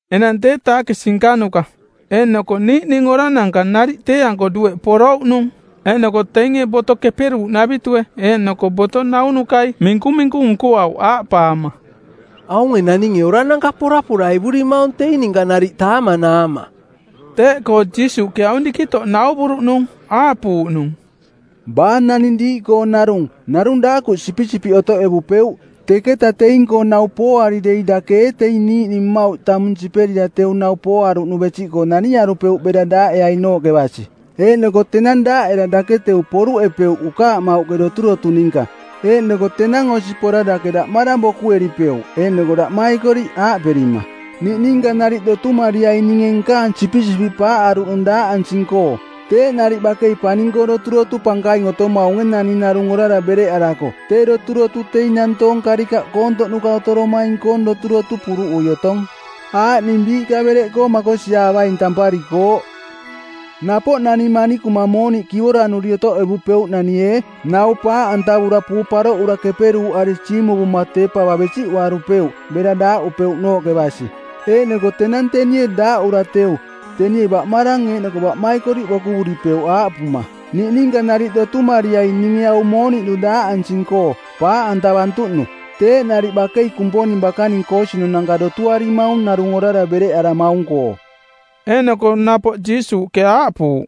Enang tee taakisi nkanuka eeꞌnoko niiꞌning orananka nariꞌ tee-anko dueꞌ porouꞌnung. Eeꞌnoko teinge Boto Keperuuꞌnavitue eeꞌnoko boto naunukai minkuminku nkoauꞌ aaꞌpaama, “Aunge naninge orananka poraporaivurimaung teing ninka nariꞌ taamanaama.” Teeꞌkoo Jiisuuꞌke aung dikitoꞌ nauvuruꞌnung, aaꞌpuuꞌnung, “Baa naning diiꞌkoong narung, narung daakuꞌ sipisipiꞌ otoꞌevupeuꞌ, teketa teing-koo nau pooari dei dake ee teing niiꞌning mmauꞌ tamung siperira teu nau pooaruꞌnu besiꞌkoo naniarupeuꞌ bera daaꞌeainooꞌke basi? Eeꞌnoko tenang daaꞌera dake teu poruꞌepeuꞌ ukaamauꞌke doturotu ninka. Eeꞌnoko tenang osi pora dake daꞌmarang bokueripeuꞌ eeꞌnoko daꞌmaikoriꞌ aaꞌperima, ‘Niꞌninka nariꞌ dotumariaing ninge nkaang sipisipiꞌ paaꞌaruꞌnung daaꞌansing-koo.’ Teeꞌ nariꞌ bakei paning-koo doturotu pankaing otomaunge naning narung orara bereꞌarako tee doturotu teing nantoong karikaꞌ koontoꞌnuka otoromaing-koong doturotu puruꞌui otong, aaꞌning biiꞌka bereꞌkoo makosiaavaing tamparikooꞌ. “Napoꞌ nani manikuma mooniꞌ kivoranuri otoꞌevupeuꞌnani ee, nau paaꞌantavura puu paroꞌura keperuuꞌari siimuvuma tee pava besiꞌuarupeuꞌ bera daaꞌupeuꞌnooꞌke basi? Eeꞌnoko tenang tenie daaꞌura teu, tenie baꞌmarang eeꞌnoko baꞌmaikoriꞌ bokuvuripeuꞌ aaꞌpuma, ‘Niꞌninka nariꞌ dotumariai ninge au mooniꞌnu daaꞌansing-koo, paaꞌantavantuꞌnu.’ Teeꞌ nariꞌ bakei Kumponing bakaning koosinunanka dotuarimaung narung orara bereꞌaramaung-koo.” Eeꞌnoko napoꞌ Jiisuuꞌke aaꞌpuuꞌ,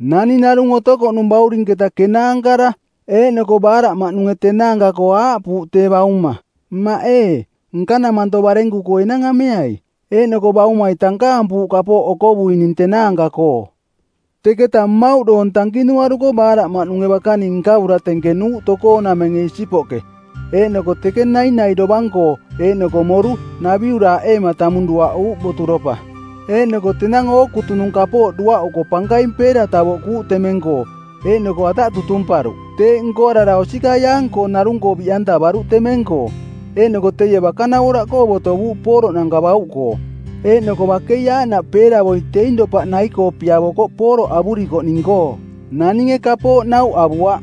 “Naning narung otokoꞌnung baurinketa kenaankara. Eeꞌnoko baaraꞌmaꞌnunge tenaanka-koo aaꞌpuuꞌ tee bauma, ‘Mmaꞌ ee, nkanamanto barenku-koo enang ameai.’ Eeꞌnoko baumai tankaampuuꞌ kapooꞌ okovuining tenaanka-koo. Teketa mmauꞌ doong tankinuaruko baaraꞌmaꞌnunge bakaning nkavura tenkenuuꞌ tokoonamenge isipoꞌke, eeꞌnoko teke nainai dovang-koo eeꞌnoko moru, naviuraaꞌeema tamung duaꞌuuꞌ boturopa. Eeꞌnoko tenang ookutunung kapooꞌ duaꞌuko pankaing peera tavoꞌkuuꞌ temeng-koo, eeꞌnoko ataꞌ tutumparuꞌ. Teeꞌ nkoarara osikaiaang-koong narung-koo biꞌantavaruꞌ temeng-koo. Eeꞌnoko teie bakanavoraꞌkoo botovuuꞌ pooroꞌnanka bauꞌkoo. Eeꞌnoko bakei aaꞌnaꞌ peeravoi teing dopaꞌ nai-koo piavokoꞌ pooroꞌ avurikoꞌning-koo. Naninge kapooꞌ nauꞌ avuaꞌ.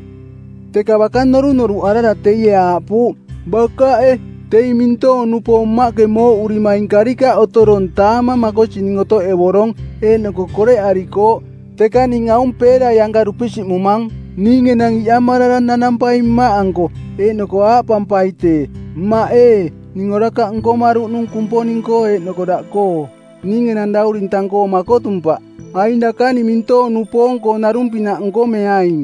“Teka baka norunoruꞌarara teie aaꞌpuuꞌ, ‘Bakaꞌe, teing mintoong-nupoong mmaꞌke mooꞌurimaing karikaꞌ otorong taamang makosining otoꞌevorong eeꞌnoko koreꞌarikooꞌ, teka ning aung peerai anka dupisiꞌmumang. Ning enang iꞌamarara nanampaing mmaꞌanko, eeꞌnoko aaꞌpampai tee, “Mmaꞌ ee, ning orakaꞌ nkomaruꞌnung Kumponing-koo eeꞌnoko daꞌkoo. Ning enang dauring tang-koo makotumpaꞌ. Aing dakaning mintoong-nupoong-koong narung-pinaꞌ nkomeaing.” ’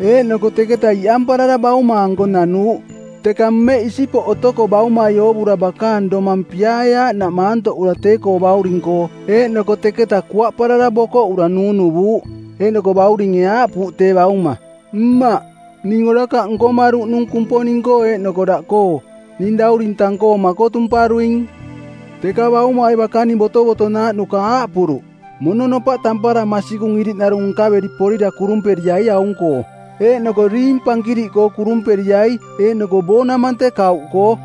Eeꞌnoko teketaꞌ iꞌamparara bauma-anko nanuuꞌ. Teka mmeꞌ isipoꞌ otoko baumai oovura bakaang domang piaae aaꞌnaꞌ maantoꞌura tee-koo bauring-koo, eeꞌnoko teketa kuaꞌparara bokoꞌura nuunuvuuꞌ. Eeꞌnoko bauringe aaꞌpuuꞌ tee bauma, ‘Mmaꞌ, ning orakaꞌ nkomaruꞌnung Kumponing-koo eeꞌnoko daꞌkoo. Ning dauring tang-koo makotumparuing.’ “Teka baumai bakaning botovotonaaꞌnuka aaꞌpuruꞌ, ‘Mononopaꞌ tampara masikung iriꞌnarung nkaveri porira kurumperiai aung-koo, eeꞌnoko riing pankiriꞌkoo kurumperiai eeꞌnoko boonamante˜ kauꞌkoo.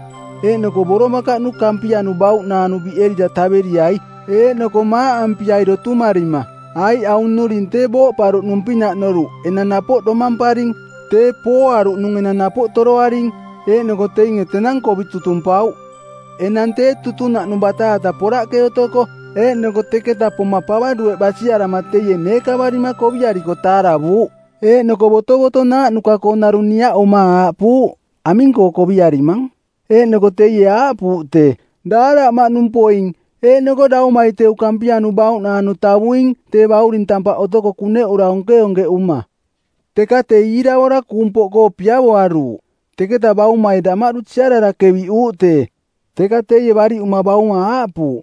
Eeꞌnoko boromakaꞌnu kampianu bauꞌnaanu biꞌerira taveriai, eeꞌnoko maaꞌampiai dotumarima, aiꞌ aung nnuring tee booꞌparuꞌnung-pinaꞌ noruꞌ enang napoꞌ domamparing; tee pooaruꞌnung enang napoꞌ toroaring.’ Eeꞌnoko teinge tenang kovi tutumpauꞌ. “Enang tee tutunaꞌnung bataata poraꞌke otoko, eeꞌnoko teketa poma pava dueꞌ basiarama teie neekavarima koviariko taaravuuꞌ. Eeꞌnoko botovotonaaꞌnuka-koo narung niaꞌuma aaꞌpuuꞌ, ‘Aming-koo koviarimang?’ Eeꞌnoko teie aaꞌpuuꞌ tee, ‘Daaraꞌmaꞌnung poing, eeꞌnoko daumai teu kampianu bauꞌnaanu tavuing tee bauring tampaꞌ otoko kuneꞌura onkeonkeꞌuma.’ “Teka tee iiravora kuung poꞌkoo piavoaruuꞌ. Teketa baumai damaꞌdu siarara keviꞌuuꞌ tee. Teka teie bariꞌuma bauma aaꞌpuuꞌ,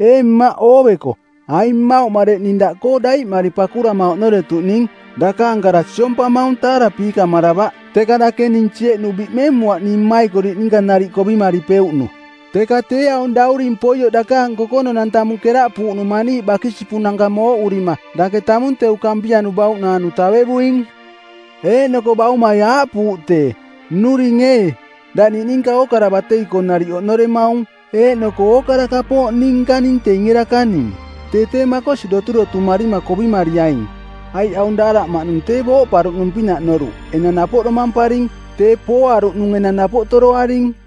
‘Ee mmaꞌ ooveko, aing mmauꞌ mareꞌ ning daꞌkoo daiꞌmari pakurama oꞌnoretuꞌning. Dakaang kara siompamaung taarapiikamaravaꞌ, teka dake ning sieꞌnu biꞌmemuaꞌ ning mmaikoriꞌ ninka nariꞌ kovimaripeuꞌnu. Teka tee aung dauring poioꞌ dakaang kokononang tamung keraꞌpuuꞌnung maniiꞌ bakisipunanka mooꞌurima dake tamung teu kampianu bauꞌnaanu tavevuing.’ “Eeꞌnoko baumai aaꞌpuuꞌ tee, ‘Nnuring ee, daꞌ niꞌninka ookara batei-koo nariꞌ oꞌnoremaung, eeꞌnoko ookara kapooꞌ ning nkaning teinge dakaning. Tee tee makosi doturotumarima kovimariaing, aiꞌ aung daaraꞌmaꞌnung tee booꞌparuꞌnung-pinaꞌ noruꞌ enang napoꞌ domamparing; tee pooaruꞌnung enang napoꞌ toroaring.’”